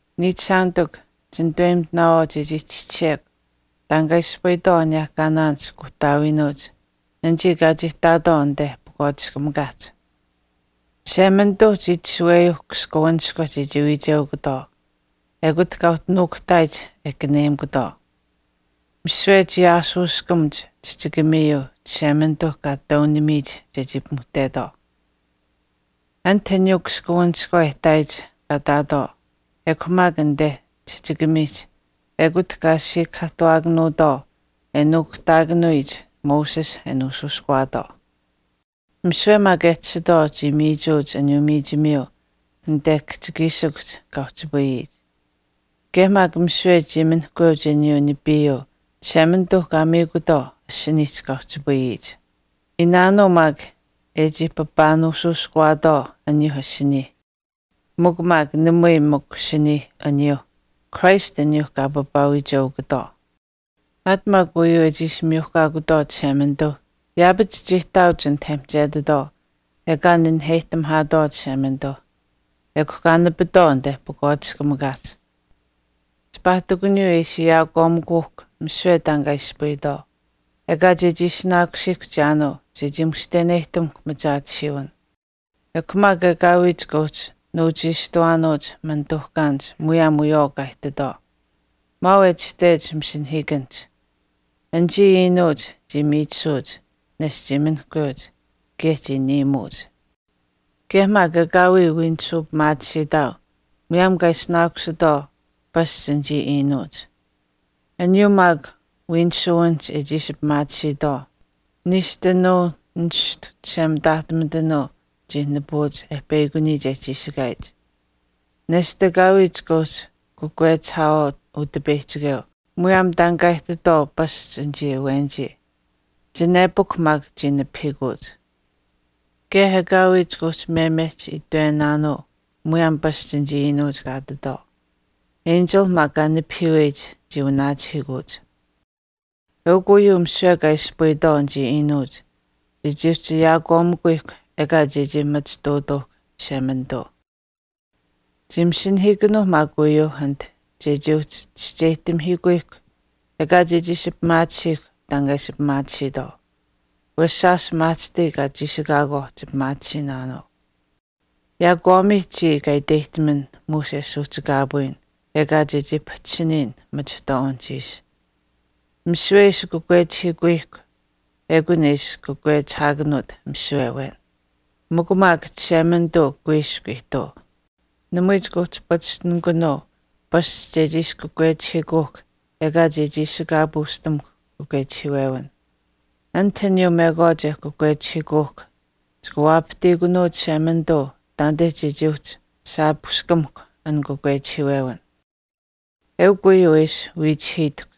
Niichishaanitikw, chinitaweyimitinaawaau chechii chischisiyekw taan kaa ispayitwaau aniyehkaanaanich kuuhtaawiinuuch anichii kaa chii ihtaatwaau anite pakwaatiskamikaahch. Chishemanituuh chii itashuweyuu kaskawanishkwa chechii wiicheukutwaau, ekut kaa uhchi nuukuhtaayich e kanuweyimikutwaau. Misiwe chii aashuuskamuch chihchikamiyuu Chishemanituu kaa taunamiyich chechii pimuhtetwaau. Anit aniyuu kaskawanishkwa e ihtaayich kaa ihtaatwaau ekw maak anite chihchikamiihch ekut kaa siikahaahtuwaakanuutwaau e nuukuhtaakanuyich Moses e nuushuushkuwaatwaau. Misiwe maak e tashitwaau chii miichuuch aniyuu miichimiyuu anite kihchikiishikuhch kaa uhchipayiyich. Kaye maak misiwe chii minihkweuch aniyuu nipiiyuu Chishemanituu kaa miikutwaau asiniihch kaa uhchipayiyich. Iinaanuu maak e chii papaa nuushuushkaakutwaau aniyuuh asiniih, mikw maak namui mikw asiniih aniyuu, Christ aniyuuh kaa papaawiicheukutwaau. Aat maak uyuu e chii ishi miyuhkaakutwaau Chishemanituuh, yaapach chii ihtaauch anit e mihchetitwaau ekaa naniheyihtamihaatwaau Chishemanituuh, ekw maak kaa nipitwaau anite pakwaatiskamikaahch. Chipaa ihtakuniyuu e ishi ayaakwaamimikuuhkw misiwe taan kaa ispayitwaau, ekaa chechii ishinaakusiihkw chiyaanuu chechii mushteneyihtamuhkw machaatisiiwin. Ekw maak ekaawii chikaa uhchi nuuchiishtuwaanuuch manituuhkaanich muyaam wiyawaau kaa ihtitwaau. Maau e itashtech masinahiikanihch, Anichii iinuuch chii miichisuuch, nesht chii minihkweuch, kaye chii niimuuch. Kaye maak ekaawii wiinisuu pimaatisiitaau muyaam kaa ishinaakusitwaau pasch anichii iinuuch. Aniyuu maak wiinisuwinihch e chii ishi pimaatisiitwaau, Niishtunuu nishtu chishemitaahtumitanuu chii nipuuch e peyakuniyich e chiishikaayich. Nesht ekaawii chika uhchi kakwechihaawaau Utipeyihchikeu muyaam taan kaa ihtitwaau pasch anichii awenichii. Chinepukw maak chii nipahiikuuch. Kaye ekaawii chika uhchi memehch itwenaanuu muyaam pasch anichii iinuuch kaa ihtitwaau. Enchilh maak kaa nipahiiweyich chii wanaachihiikuuch. Eukw uyuu misiwe kaa ispayitwaau anichii iinuuch chechii uhchi ayaakwaamimikuyihkw ekaa chechii machituutuuhkw Chishemanituu. Chii masinahiikanuuh maak uyuu anit chechii uhchi chischeyihtamihiikuyihkw ekaa chechii ishi pimaatisiihkw taan kaa ishi pimaatisiitwaau. Wesh shaash maahchishtai kaa chiishikaakwaauh chipimaatisiinaanuu. Yaakwaamiih chiya kaa iteyihtaman muush e suuhchikaapuuyin ekaa chechii pahchishiniyin machihtwaawinihch ishi. Misiwe e ishi kakwechihiikuyihkw, ekun e ishi kakwechihaakanuut misiwe awen. Mikw maak Chishemanituu kuiskw ihtuu. Namui chika uhchi pachishtinikunuu paashich chechii ishi kakwechihiikuuhkw ekaa chii ishikaapuushtamuhkw kakwechihiiwewin. Anit aniyuu mekwaach e kakwechihiikuuhkw chika waapahtiikunuu Chishemanituu taanite chechii uhchi shaapushkamihkw an kakwechihiiwewin. Eukw uyuu e ishi wiichihiitahkw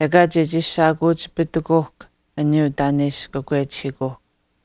ekaa chechii shaakuuchipitikuuhkw aniyuu taan e ishi kakwechihiikuuhkw.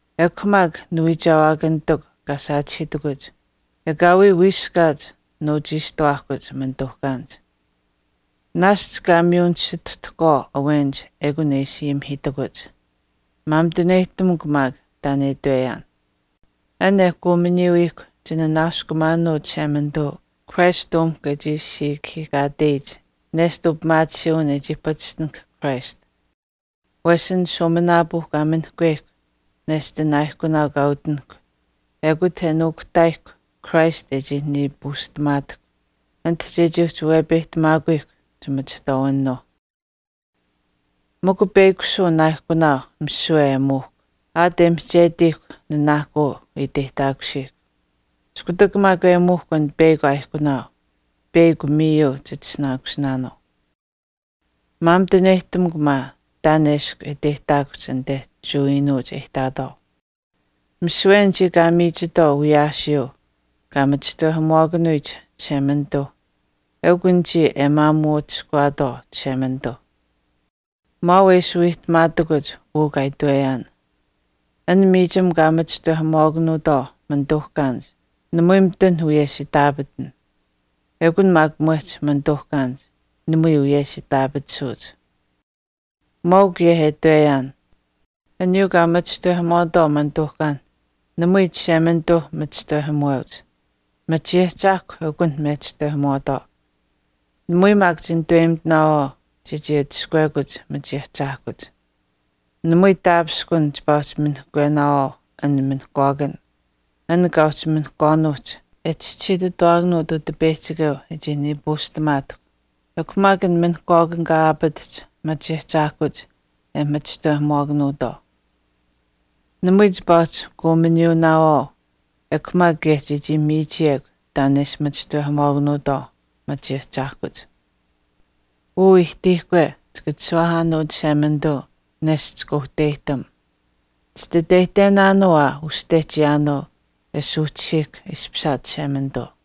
Ekw maak niwiichewaakanitikw kaa saachihiitakuch, ekaawii wiiskaat nuuchiishtuwaahkuch manituuhkaanich. Naashch kaa miyu nisituhtahkwaau awenich ekun e ishi ayimihiitakuch. Maamituneyihtamukw maak taan e itweyaan. An e kuuminiyuyihkw chinanaaskumaanuu Chishemanituu Christ umihkw e chii siikahiikaateyich nesht upimaatisiiwin e chii patishtinahk Christ. Wesh an shuuminaapuu kaa minihkweyihkw nesht an aaihkunaau kaa utinahk ekut nuukuhtaayihkw Christ e chii nipistamaatahkw ati chechii uhchi wepeyihtamaakuyihkw chimachihtwaawinuuh. Mikw peyakushuu an aaihkunaau misiwe e muuhkw, aat e mihchetiihkw nanaahkuu e iteyihtaakusiihkw. Iskutak maak e muuhkw an peyakw aaihkunaau peyakw miyu chitishinaakusinaanuu. Maamituneyihtamukw maa taan eshkw e iteyihtaakuhch anite Jewa iinuuch e ihtaatwaau. Misiwe anichii kaa miichitwaau wiyaasiyuu kaa machishtawehamuwaakanuyich Chishemanituuh eukw anichii e maamuu atushkuwaatwaau Chishemanituuh. Maau e ishi wiihtamaatakuch uu kaa itweyaan. An miichim kaa machishtawehamuwaakanuutwaau manituuhkaanich, namui mitun wiyesh itaapatan. Ekun maak mwehch manituuhkaanich, namui wiyesh itaapatisuuch. Maau kaye e itweyaan. Aniyuu kaa machishtawehamuwaatwaau manituuhkaan, namui Chishemanituu machishtawehamuweuch, machiahchaahkwa eukunh mechishtawehamuwaatwaau. Namui maak chinitaweyimitinaawaau chechii atushkuwekuch machahchaahkuch. Namui taapishkun chipaa uhchi minihkwenaawaau an minihkwaakan, an kaa uhchi minihkwaanuuhch e chischisiitutawaakanuut Utipeyihchikeu e chii nipuushtamaatahkw, ekw maak an minihkwaakan kaa aapatahch machahchaahkuch e machishtawehamuwaakanuutwaau. Namui chipaa uhchi kuuminuunaawaau ekw maak kaye chechii miichiyekw taan e ishi machishtawehamuwaakanuutwaau machahchaahkuch. Uu ihtiihkwe, chika chishuwaahaanuu Chishemanituu nesht chika uhteyihtam. Chititeyihtenaanuu aa uste chiyaanuu e suuhchisiihkw ishpishaat Chishemanituu.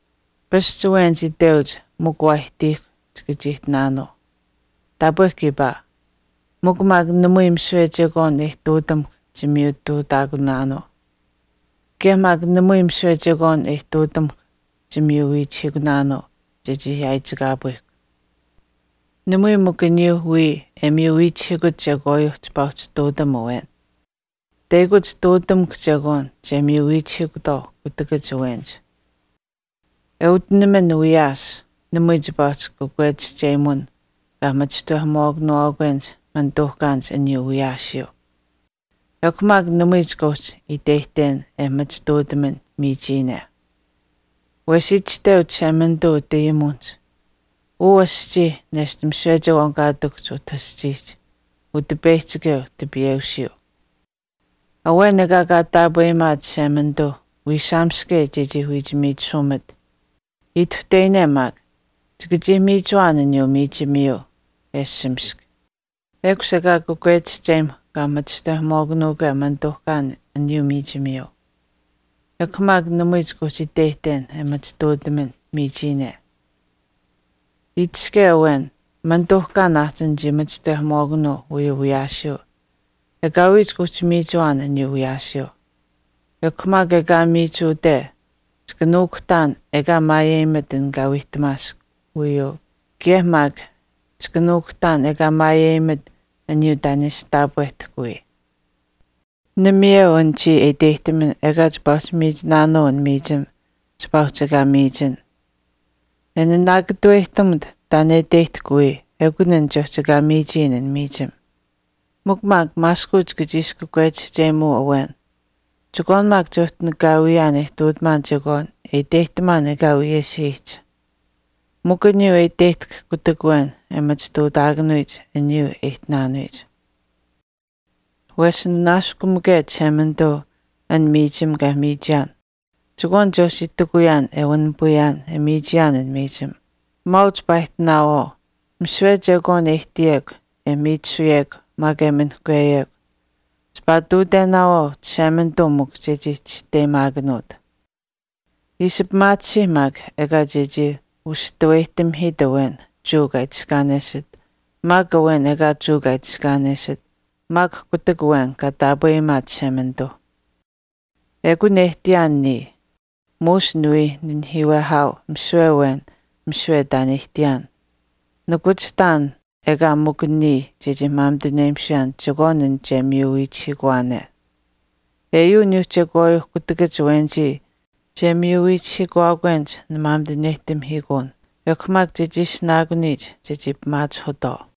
Pasch awenich iteuch mikw waa ihtiihkw chika chii ihtinaanuu. Taapwe kiipaa. Mikw maak namui misiwe chekwaan e ihtuutamuhkw chimiyutuutaakunaanuu. Kaye maak namui misiwe chekwaan e ihtuutamuhkw chimiyu wiichihiikunaanuu chechii yaaichikaapuyihkw. Namui mikw aniyuu wii e miyu wiichihiikut chekwaayuu chipaa uhchi ihtuutam awen. Teyakuch ihtuutamukw chekwaan che miyu wiichihiikutwaau kutakach awenich. E utinaman wiyaas, namui chipaa uhchi kakwechihchemun kaa machishtawehamuwaakanuwaakwenich manituuhkaanich aniyuu wiyaasiyuu. Ekw maak namui chika uhchi iteyihten e machituutaman miichiyine. Wesh itashteu Chishemanituu utayimuwinihch, “Uu aschii nesht misiwe chekwaan kaa ihtakuhch utah aschiihch, Utipeyihchikeu tipiiweusiyuu.” Awen ekaa kaa taapweyimaat Chishemanituu wiisaamaske chechii wiich miichisumat, ituhteyine maak, chika chii miichuwaan aniyuu miichimiyuu e ashamisk. Ekush ekaa kakwechim kaa machishtawehamuwaakanuukwe manituuhkaan aniyuu miichimiyuu. Ekw maak namui chika uhchi iteyihten e machituutaman miichiyine. Itiske awen, “Manituuhkaan aahchin chii machishtawehamuwaakanuu uyuu wiyaasiyuu,” ekaawii chika uhchi miichuwaan aniyuu wiyaasiyuu. Ekw maak ekaa miichuwate chika nuukuhtaan ekaa maayeyimat an kaa wiihtamaask uyuu kaye maak chika nuukuhtaan ekaa maayeyimat aniyuu taan e ishi taapwehtahk wiya. Namayeu an chiya e iteyihtaman ekaa chipaa uhchi miichinaanuu an miichim chipaa uhchi ekaa miichin. E nanaakatuweyihtamut taan e iteyihtahk wiya ekun an che uhchi ekaa miichiyin an miichim. Mikw maak maaskuch chika chii ishi kakwechihchemuu awen, “Chekwaan maak che uhchi nakaawiyaan e ihtuutamaan chekwaan e iteyihtamaan ekaa wiyesh aihch, mikw aniyuu e iteyihtahk kutak awen e machituutaakanuyich aniyuu e ihtinaanuyich. Wesh nanaaskumake Chishemanituu an miichim kaa miichiyaan, chekwaan che uhchi itikuyaan e wanipayaan e miichiyaan an miichim.” Maau chipaa ihtinaawaau. Misiwe chekwaan e ihtiyekw, e miichisuyekw maak e minihkweyekw, chipaa ihtuutenaawaau Chishemanituu mikw chechii chisteyimaakanuut. Ishi pimaatisiih maak ekaa chechii ustaweyihtamihiit awen Jewa kaa itiskaanesit maak awen ekaa Jewa kaa itiskaanesit maak kutak awen kaa taapweyimaat Chishemanituuh. Ekun e ihtiyaan niya, muush niwii nahiiwehaau misiwe awen misiwe taan e ihtiyaan. Nikuchihtaan ekaa mikw niya chechii maamituneyimisuyaan chekwaan an che miyu wiichihiikuwaane. Eyuu aniyuuh chekwaayuuh kutakach awenich che miyu wiichihiikuwaakwenich nimaamituneyihtamihiikuun, ekw maak chechii ishinaakuniyich chechii pimaachihutwaau.